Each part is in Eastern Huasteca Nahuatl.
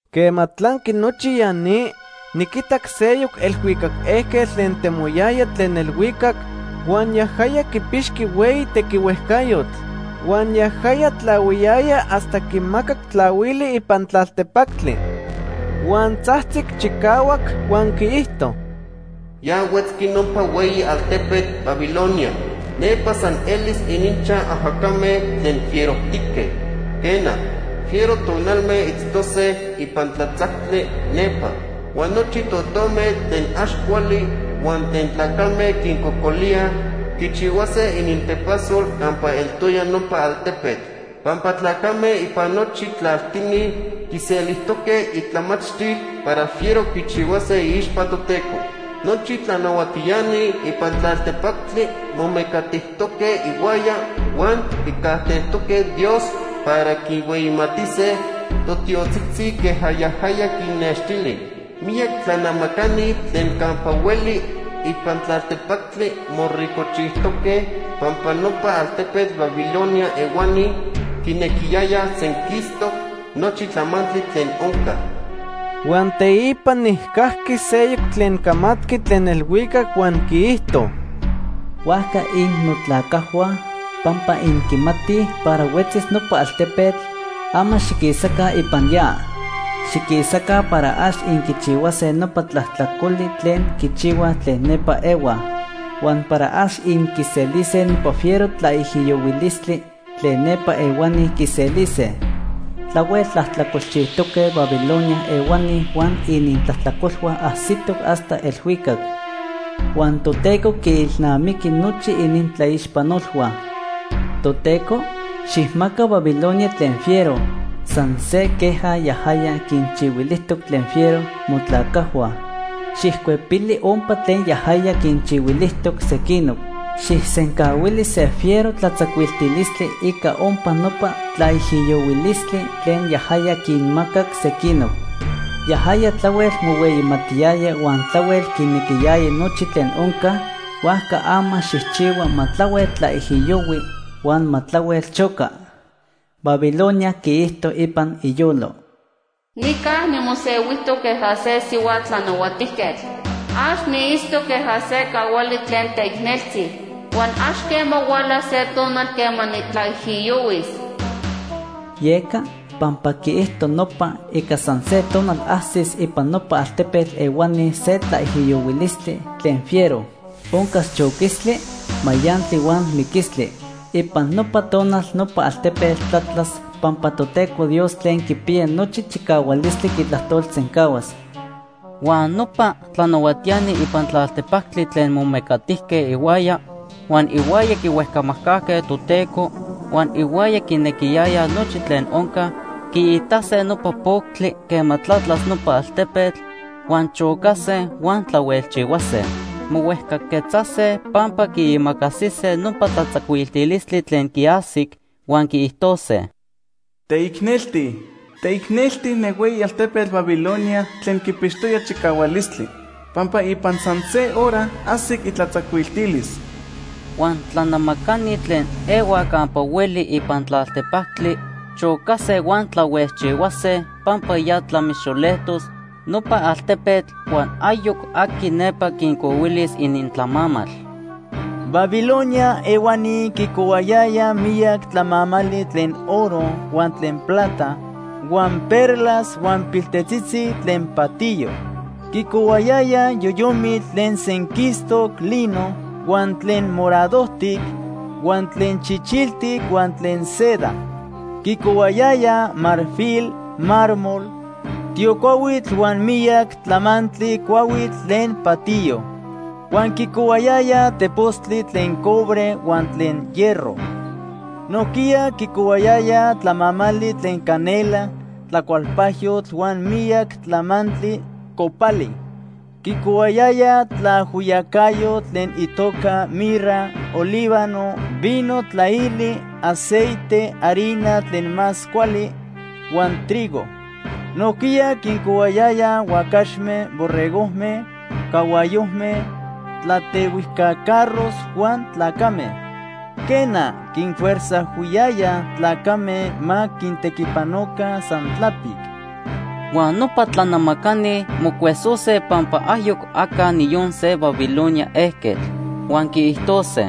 Quema tlanqui nochi ya ni, niquitac seyoc elhuicac ejquetl tlen temoyaya tlen elhuicac, huan yajaya quipixqui hueyi tequihuejcayotl. Huan yajaya tlahuiyaya hasta quimacac tlahuili ipan tlaltepactli. Huan tzajtzic chicahuac huan quiijto: “Ya huetzqui nopa hueyi altepetl Babilonia. Nepa san elis ininchaj ajacame tlen fierojtique. Quena, fiero tonalme itztose ipan tlatzactli nepa. Huan nochi totome tlen ax cuali huan tlen tlacame quincocolíaj quichihuase inintepasol campa eltoya nopa altepetl. Pampa tlacame ipan nochi tlaltini quiselijtoque itlamachtil para fiero quichihuase iixpa Toteco. Nochi tlanahuatiani ipan tlaltepactli momecatijtoque ihuaya huan quicajtejtoque Dios para quinhueyimatise totiotzitzi queja yajaya quinnextili. Miyac tlanamacani tlen campa hueli ipan tlaltepactli moricojchijtoque pampa nopa altepetl Babilonia ehuani quinequiyayaj senquistoc nochi tlamantli tlen onca.” Huan teipa nijcajqui seyoc tlen camatqui tlen elhuicac huan quiijto: “Huajca innotlacajhua, pampa inquimatij para huetzis nopa altepetl, ama xiquisaca ipan ya. Xiquisaca para ax inquichihuase nopa tlajtlacoli tlen quichihuaj tlen nepa ehuaj, huan para ax inquiselise nopa fiero tlaijiyohuilistli tlen nepa ehuani quiselise. Tlahuel tlajtlacolchijtoque Babilonia ehuani huan inintlajtlacolhua ajsitoc hasta elhuicac. Huan Toteco quiilnamiqui nochi inintlaixpanolhua. Toteco, xijmaca Babilonia tlen fiero, san se queja yajaya quinchihuilijtoc tlen fiero motlacajhua. Xijcuepili ompa tlen yajaya quinchihuilijtoc sequinoc. Xijsencahuili se fiero tlatzacuiltilistli ica ompa nopa tlaijiyohuilistli tlen yajaya quinmacac sequinoc. Yajaya tlahuel mohueyimatiyaya huan tlahuel quinequiyaya nochi tlen onca, huajca ama xijchihua ma tlahuel tlaijiyohui huan ma tlahuel choca. Babilonia quiijto ipan iyolo: ‘Nica nimosehuijtoc queja se sihua tlanahuatijquetl. Ax niitztoc queja se cahuali tlen teicneltzi. Huan ax quema hualas se tonal quema nitlaijiyohuis.’ Yeca, pampa quiijto nopa, ica san se tonal ajsis ipan nopa altepetl ehuani se tlaijiyohuilistli tlen fiero. Oncas choquistli, mayantli huan miquistli. Ipan nopa tonal nopa altepetl tlatlas pampa Toteco Dios Tlen Quipiya Nochi Chicahualistli quitlajtolsencahuas.” Huan nopa tlanahuatiani ipan tlaltepactli tlen momecatijque ihuaya, huan ihuaya quihuejcamajcajque Toteco, huan ihuaya quinequiyayaj nochi tlen onca, quiitase nopa poctli quema tlatlas nopa altepetl, huan chocase, huan tlahuelchihuase. Mohuejcaquetzase pampa quiimacasise nopa tlatzacuiltilistli tlen quiajsic, huan quiijtose: “¡Teicnelti, teicnelti ne hueyi altepetl Babilonia tlen quipixtoya chicahualistli! ¡Pampa ipan san se hora ajsic itlatzacuiltilis!” Huan tlanamacani tlen ehuaj campa hueli ipan tlaltepactli chocase huan tlahuejchihuase pampa ya tlamixoletos nopa altepetl huan ayoc aqui nepa quincohuilis inintlamamal. Babilonia ehuani quicohuayayaj miyac tlamamali tlen oro, huan tlen plata, huan perlas huan piltetzitzi tlen patiyo. Quicohuayayaj yoyomitl tlen senquistoc lino, huan tlen moradojtic, huan tlen chichiltic huan tlen seda. Quicohuayayaj marfil, mármol, tiocuahuitl huan miyac tlamantli cuahuitl tlen patiyo. Huan quicohuayayaj tepostli tlen cobre huan tlen hierro. Nojquiya quicohuayayaj tlamamali tlen canela, tlacualpajyotl huan miyac tlamantli copali. Quicohuayayaj tlaajhuiyacayotl tlen itoca mirra, olíbano, vino tlaili, aceite, harina tlen más cuali, huan trigo. Nojquiya quincohuayayaj huacaxme, borregojme, cahuayojme, tlatehuijca carros huan tlacame. Quena, quinfuerzajhuiyayaj tlacame ma quintequipanoca san tlapic. Huan nopa tlanamacani mocuesose pampa ayoc aca niyon se Babilonia ejquetl. Huan quiijtose: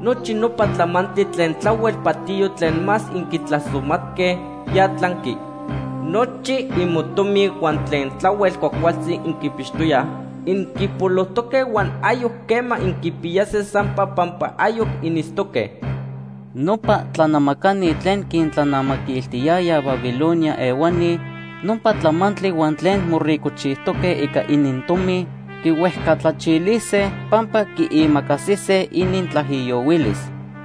“Nochi nopa tlamantli tlen tlahuel patiyo tlen más inquitlasomatque, ya tlanqui. Nochi imotomi huan tlen tlahuel cuajcualtzi inquipixtoyaj, inquipolojtoque huan ayoc quema inquipiyase sampa pampa ayoc initztoque.” Nopa tlanamacani tlen quintlanamaquiltiyayaj Babilonia ehuani nopa tlamantli huan tlen moricojchijtoque ica inintomi, quihuejcatlachilise pampa quiimacasise inintlaijiyohuilis.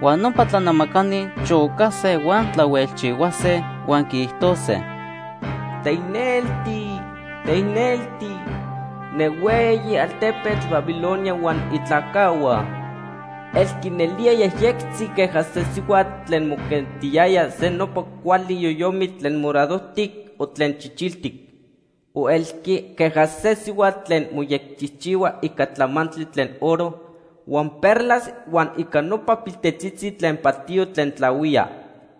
Huan nopa tlanamacani chocase huan tlahuelchihuase, huan quiijtose: “¡Teicnelti, teicnelti ne hueyi altepetl Babilonia huan itlacajhua! Elqui nelía yejyectzi queja se sihuatl tlen moquentiyaya se nopa cuali yoyomitl tlen moradojtic o tlen chichiltic. O elqui queja se sihuatl tlen moyecchijchihua ica tlamantli tlen oro, huan perlas huan ica nopa piltetzitzi tlen patiyo tlen tlahuía.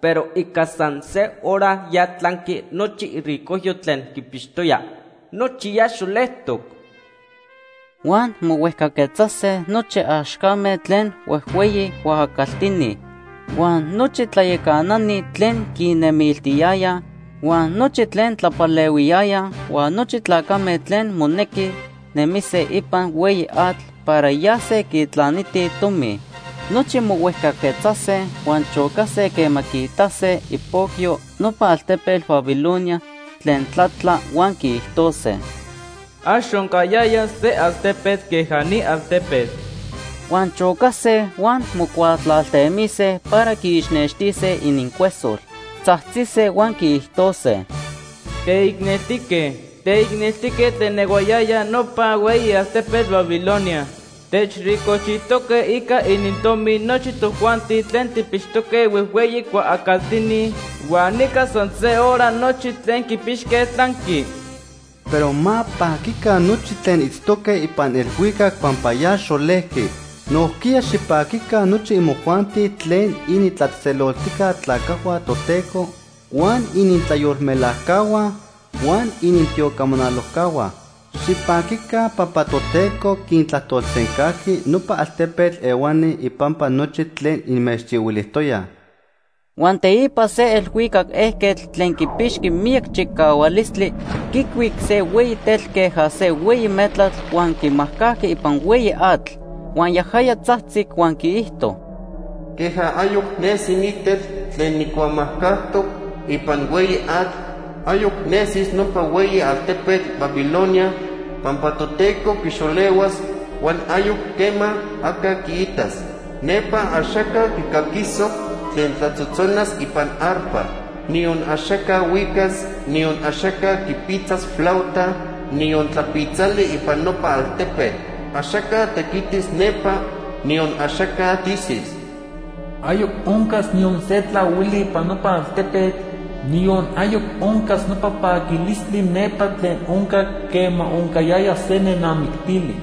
Pero ica san se hora ya tlanqui nochi iricojyo tlen quipixtoya. ¡Nochi ya xolejtoc!” Huan mohuejcaquetzase nochi axcame tlen huejhueyi cuaacaltini, huan nochi tlayacanani tlen quinnemiltiyayaj, huan nochi tlen tlapalehuiyayaj, huan nochi tlacame tlen monequi nemise ipan hueyi atl para yase quitlanitij tomi. Nochi mohuejcaquetzase huan chocase quema quiitase ipocyo nopa altepetl Babilonia tlen tlatla huan quiijtose: “Ax oncayaya se altepetl queja ni altepetl.” Huan chocase huan mocuatlaltemise para quiixnextise inincuesol. Tzajtzise huan quiijtose: “¡Teicneltique, teicneltique tlen ehuayaya nopa hueyi altepetl Babilonia! Techricojchijtoque ica inintomi nochi tojuanti tlen tijpixtoque huejhueyi cuaacaltini, huan ica san se hora nochi tlen quipixque tlanqui.” Pero ma paquica nochi tlen itztoque ipan elhuicac pampa ya xolejqui. Nojquiya xipaquica nochi imojuanti tlen initlatzejtzeloltijca tlacajhua Toteco, huan initlayolmelajcahua huan initiocamanalojcahua. Xipaquica pampa Toteco quintlajtolsencajqui nopa altepetl ehuani ipampa nochi tlen inmechchihuilijtoyaj. Huan teipa se elhuicac ejquetl tlen quipixqui miyac chicahualistli quicuic se hueyi tetl queja se hueyi metlatl huan quimajcajqui ipan hueyi atl. Huan yajaya tzajtzic huan quiijto: “Queja ayoc nesi ni tetl tlen nijcuamajcajtoc ipan hueyi atl, ayoc nesis nopa hueyi altepetl Babilonia pampa Toteco quixolehuas huan ayoc quema aca quiitas. Nepa axaca quicaquisoc tlen tlatzotzonas ipan arpa. Niyon axaca huicas, niyon axaca quipitzas flauta, niyon tlapitzali ipan nopa altepetl. Axaca tequitis nepa, niyon axaca tisis. Ayoc oncas niyon se tlahuili ipan nopa altepetl, niyon ayoc oncas nopa paquilistli nepa tlen oncac quema oncayaya se nenamictili.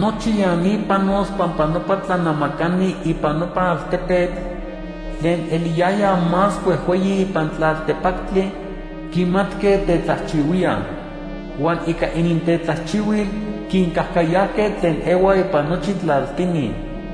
Nochi ya ni panos pampa nopa tlanamacani ipan nopa altepetl tlen eliyayaj más huejhueyi ipan tlaltepactli quimatque tetlajchihuíaj. Huan ica inintetlajchihuil quincajcayajque tlen ehuaj ipan nochi tlaltini.”